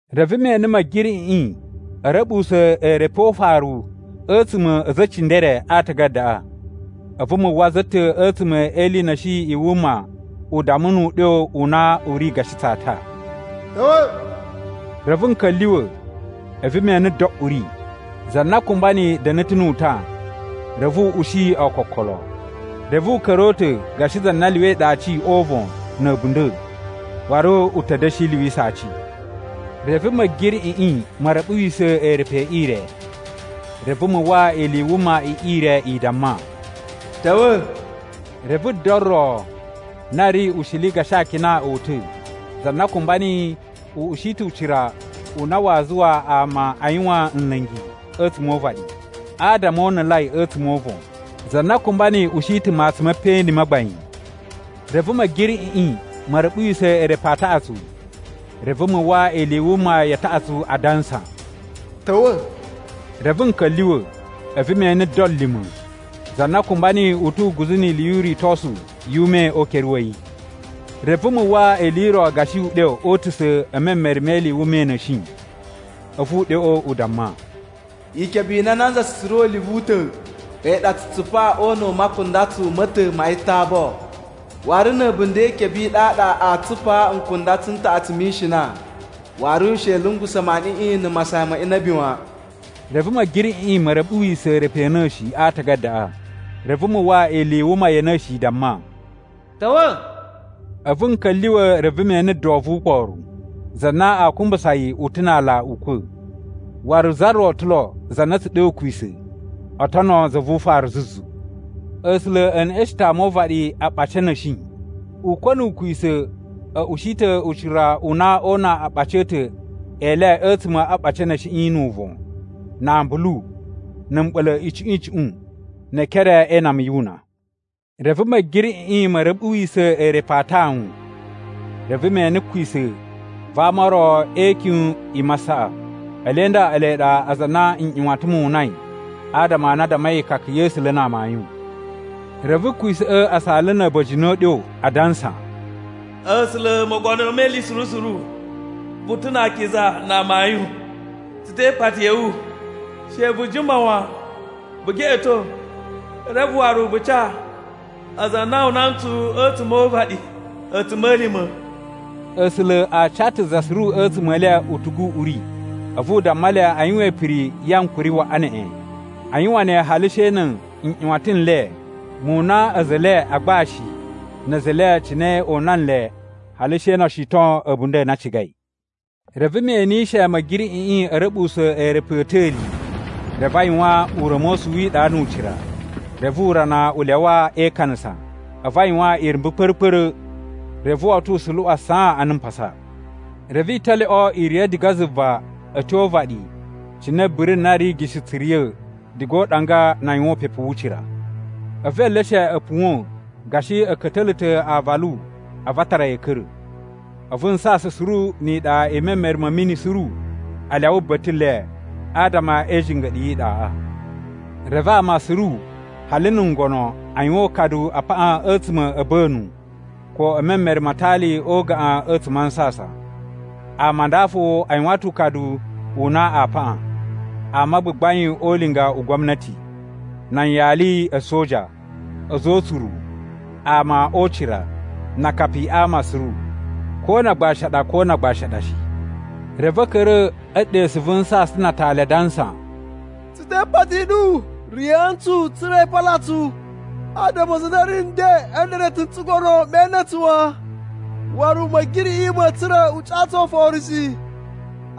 Reve me ene Ma̱giriꞌiꞌi a̱ ra̱ɓuwusa̱ eerepu o ufaru a̱tsuma̱ a̱ a̱za̱ e cindere a aatagadaꞌa. A̱vu mu uwwa za ta̱ a̱tsuma̱ e ili i na̱shi i wuma u damma nu uɗyo u na u ri gashi tsata, “Ta̱wa̱!” Reve n ka̱lyuwa̱, a̱vu me ene do uri. Za na kumba niyi da̱na̱ ta̱ nu utan, reve u ushi ookokolo. Reve u ka̱ra̱ o uta̱ gashi za na lyuwai ɗe aci o uvon na̱ a̱bunda̱, waru u ta̱ da̱shi lyuwisa aci. Reve Ma̱giriꞌiꞌi ma̱ ra̱ɓuwisa̱ eerepu e ire, reve mu uwwa ili i wuma i ire i damma, “Ta̱wa̱!” Reve do ro na ri ushili gashi akina o uta̱. Za na kumba niyi u ushi ta̱ ucira u na waa zuwa ama a yuwan nla̱ngi a̱tsuma̱ o uvaɗi, adama o unulai a̱tsuma̱ o uvon. Za na kumba niyi ushi ta̱ matsun me peꞌeni ma gbain. Reve Ma̱giriꞌiꞌi ma̱ ra̱ɓuwisa̱ eerepu a taꞌatsu, reve mu uwwa ili i wuma ya taꞌatsu adansa, “Ta̱wa̱!” Reve n ka̱lyuwa̱, a̱vu me ene do lima̱. Za na kumba niyi u tu uguzu ni ili yu uritosu yu ume o ukere wa̱ yi. Reve mu uwwa ili i ro gashi uɗyo o utusa̱ e memere me ili i wuma i na̱shi. A̱vu uɗyoꞌo u damma, “Ikebe i na nanza tsu tsura̱ o ulivu u ta̱, a̱yi ɗa a tsu tsupa o una̱ u makundatsu ma̱ ta̱ ma yitabo. Waru na̱ a̱bunda̱ e ikebe i ɗaɗa aa tsupaa nkundatsu n taꞌatsu mi ishina. Waru she i lungusa̱ maniꞌiꞌin na̱ masayan ma inabi wan.” Reve Ma̱giriꞌiꞌi ma̱ ra̱ɓuwisa̱ eerepu a̱ na̱shi a aatagadaꞌa, reve mu uwwa ili i wuma ya̱ na̱shi i damma, “Ta̱wa̱!” A̱vu n ka̱lyuwa̱ reve me ene do vu ukporu. Za na aa kumbusa yi u ta̱ na aala Ukwa̱, waru za ro ta̱ lo za na a̱ tsu ɗe Ukwisa̱ oo tono za vu ufaru zuzu. A̱sula̱ e neꞌeshen ta̱ ama o uvaɗi aɓaci a̱ na̱shi. Ukwa̱ nu Ukwisa̱ a̱ ushi ta̱ ucira u na oo una aaɓaci a̱ ta̱ e le a̱tsuma̱ a aɓaci a̱ na̱shiꞌi nu uvon, na ambulu, na̱ mɓa̱la̱ icuꞌun icuꞌun, ne ekere e inama yu una. Reve Ma̱giriꞌiꞌi ma̱ ra̱ɓuwisa̱ eerepu a tawun. Reve me ene kwisa̱ va ama o ro e ikyun i masaꞌa. Ele nda ele ɗa aza a na nꞌyuwatan mu unai adama a na a dammai ikaka ya̱ A̱sula̱ na amayun. Reve kwisa̱ꞌa̱ a saala na̱ a̱ba̱jini o uɗyo adansa, “A̱sula̱ Mogono me Ili Suru Suru, vu ta̱ na akiza na amayun! Tsu te ipati ya̱ wu, she vu jima wan vu geꞌeto reve waru vu ca aza a na o una ntsu a̱tsuma̱ o uvaɗi a̱tsuma̱lima̱.” A̱sula̱ a ca ta̱ za suru a̱tsuma̱ e le utugu u uri a̱vu u damma le a yuwan ipiri ya ankuri waꞌa neꞌen. A yuwan ne hali she na̱ nꞌyuwatan n le mu una a̱za̱ e le a agbashi na̱ a̱za̱ e le cine o una nle hali she no o shiton a̱bunda̱ a na a cigai. Reve me enishe Ma̱giriꞌiꞌi a̱ ra̱ɓuwusa̱ eerepu a̱ ta̱li. Reve a yuwan ura̱mosu wi iɗa nu ucira. Reve urana u lyawa e ikanasa, a̱vu a yuwan irumbu kpa̱ra̱-kpa̱ra̱. Reve woto u suluwan saan ana mpasa. Reve italyoꞌo i riya̱ diga zuva a̱ tyo o uvaɗi cine biri na ri igishi tsu riya̱ diga o uɗanga na a yuwan upepu wu ucira. A̱vu eleshe a̱ puwa̱n gashi a̱ ka̱ta̱la̱ ta̱ aavalu a̱vu a tara yi a̱ ka̱ra̱. A̱vu nsasan suru ni iɗa i memere ma̱ mini suru a lyawa ba̱ta̱ le adama e ijinga̱ɗu yi iɗaꞌa. Reve ama suru, hali na̱ ngono, a yuwan ukadu a paꞌan a̱tsuma̱ a̱ a̱ba̱nu ko e memere ma atali o ugaꞌan a̱tsuma̱ a nsasan. Ama a nda fo a yuwan ta̱ ukadu u na aa paꞌan: Ama a gbagbain o ulinga u gwamnati, nan yali a̱ a̱soja, a̱za̱ o utsuru, ama o ucira, na akapi a ama suru, ko na agbashi a ɗa ko na agbashi a ɗa shi. Reve a̱ ka̱ra̱ e ɗesu vu nsasan na atali adansa, “Tsu te ipati i ɗu, riya̱a̱ ntsu tsa̱ra̱ i pala tsu adama za na ri nden a̱ nda̱na̱ta̱ n tsugono me ene tsu wan, waru Ma̱giriꞌiꞌi ma̱a̱ tsura̱ u ca tsu oforo shi.”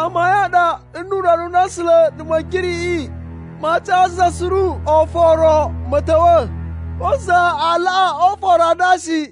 Amayun a ɗa nnu Urana u na A̱sula̱ na̱ Ma̱giriꞌiꞌi maa ca za suru oforo ma̱ ta̱wa̱, ko za a laꞌa oforo a nda shi.